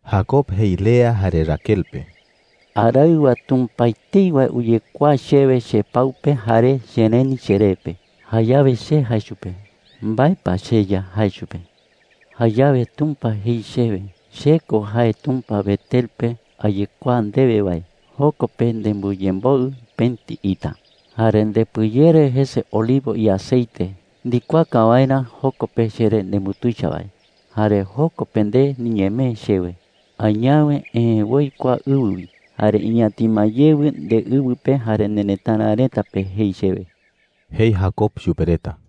Jacob jei Lea jare Raquel pe: “Araɨwa Tumpa etei wae uyekuaa chewe chepau pe jare chereni cheree pe. Jayawe che jae chupe: “¿Mbae pa, cheYa?’ jae chupe. “Jayawe Tumpa jei chewe: ‘Che ko jae Tumpa Betel pe ayekuaa ndewe wae. Joko pe nembɨyemboɨ pëti ita, jare ndepɨyere jese olivo iaceite ndikuaaka waerä joko pe cheree nembutuicha wae. Jare joko pe nde niñemee chewe. Añawe eë woi kua ɨwɨ wi jare iñatima yewɨ ndeɨwɨ pe jare nerëtara reta pe,’ jei chewe,” jei Jacob chupe reta.